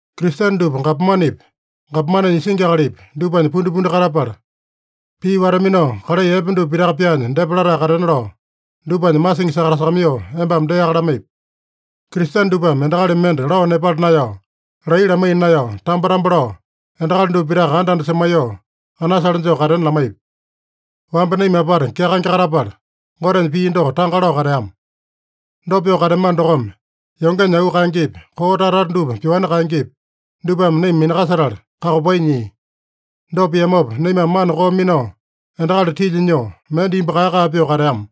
Kristene dupa gapomanepi, gapomanenya isingi akalipi, dupanya pundipundi katapala, pii wata-minao, kalai epe dupa pitaka pyaanya depa latae katena lao, dupanya masingi sakatasakamaiyoo embame deaka lamaipi. Kristene dupame endakali mende lao nepala naeyao, laiya lamaiya naeyao, tambo-tambo lao, endakali dupa pitaka anda-anda semaiyoo, anasale joo katena lamaipi. Wamba naima apata kyakaenge katapala, Gotenya pii doko tanga lao kateama. Dopa pyoo kateamano dokome, yongenya auu kaengepi, koo tata-tata dupa pyoani kaengepi, dupame naima minakasetala kakopai nyia. Dopa piamopa, naimame mana koo minao, endakali tilya nyoo, mende imbu kae-kae pyoo kateama.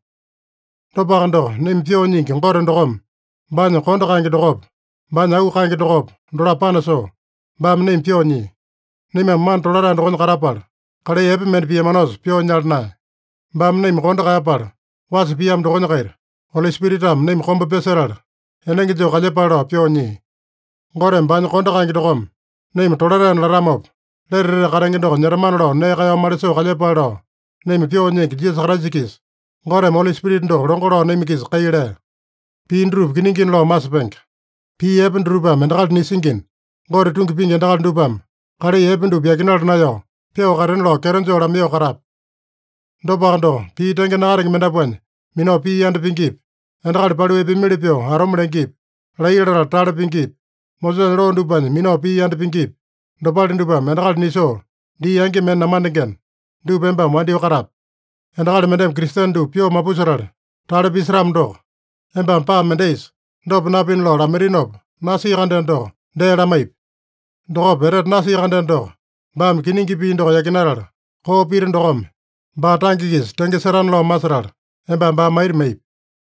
Dopaka doko, naima Pyoo Nyingi Gote dokome, baanya kondo kaenge dokopa, baanya auu kaenge dokopa, dolapo panasoo, baame naima pyoo nyia. Naimame mana tolatae dokonya katapala, kalai epe mende piamanosa pyoo nyala naeya. Baame naima kondo kaeyapala wasa piamo dokonya-kaita, Oli Spiritame naima komba pyasetala enenge joo kalyepale lao pyoo nyia. Goteme baanya kondo kaenge dokome naima tolataena latamopa, lete etete katenge doko nyetamana lao nee kaeyao malisoo kalyepale lao, naima Pyoo Nyingi Jisasa Kraisa-kisa Goteme Oli Spirita doko longo lao naima-kisa kai lea. Pii dutupa kiningina lao masepenge. Pii epe dutupame endakali nisingina, Gote tungi pingi endakali dupame kalai epe dupa yakinala naeyao, pyoo katena lao kyeto joo lamaiyoo katape. Dopaka doko, pii tenge nakatenge mendapuanya minao pii yanda pingipi, endakali paliu epeamili pyoo atome lengepi, laiya latala tale pingipi, Mosesanya loo dupanya minao pii yanda pingipi, dopale dupame endakali nisoo dii angi mende namandengena, dupa embame wandyoo katape. Endakali mendeme Kristene dupa pyoo mapusetala tale pisetamo doko, embame paa mendaisa dopa napina lao lamaitinopa nasia-kandeno doko, dee lamaipi. Dokopa etete nasia-kandeno doko, baame kiningi pii doko yakinatala koo pita dokome, baa tange-kisa tenge setana lao masetala, embame baa maita maipi.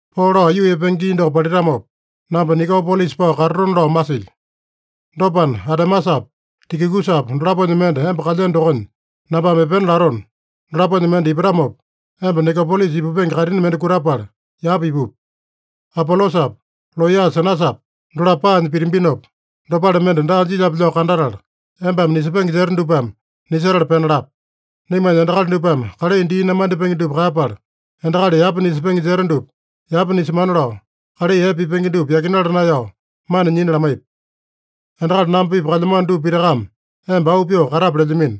Poo lao aiyuu epenge gii doko palitamopa, namba Nikopolisa pao katatona lao masilyo. Dopana, Atemasapa, Tikikusapa dolaponya mende emba kalyeno dokonya nambame epena latona, dolaponya mende ipatamopa, emba Nikopolisa ipupenge kaitini mende kutapala yapa ipupi. Apolosapa, looya Senasapa, dolapo paanya pitambinopa, dopale mende daa jilyape lao kandatala, embame nisepenge jeta dupame nisetala pena lape. Naimanya endakali dupame kalai dii namandipenge dupa kaeyapala, endakali yapa nisepenge jeta dupa yapa nisemana lao, kalai epe pipenge dupa yakinala naeyao mana nyina lamaipi. Endakali namba-pipa kalyamano dupa pitakame emba auu pyoo katape lelyamino.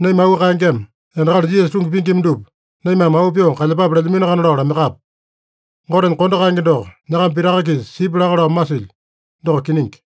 Naima auu kaengema, endakali Jisasa tungi pingima dupa naimame auu pyoo kalyepape lelyaminoakana lao lamaiyakape. Gotenya kondo kaenge doko nyakama pitaka-kisa sipya laka lao masilyo. Doko kiningi.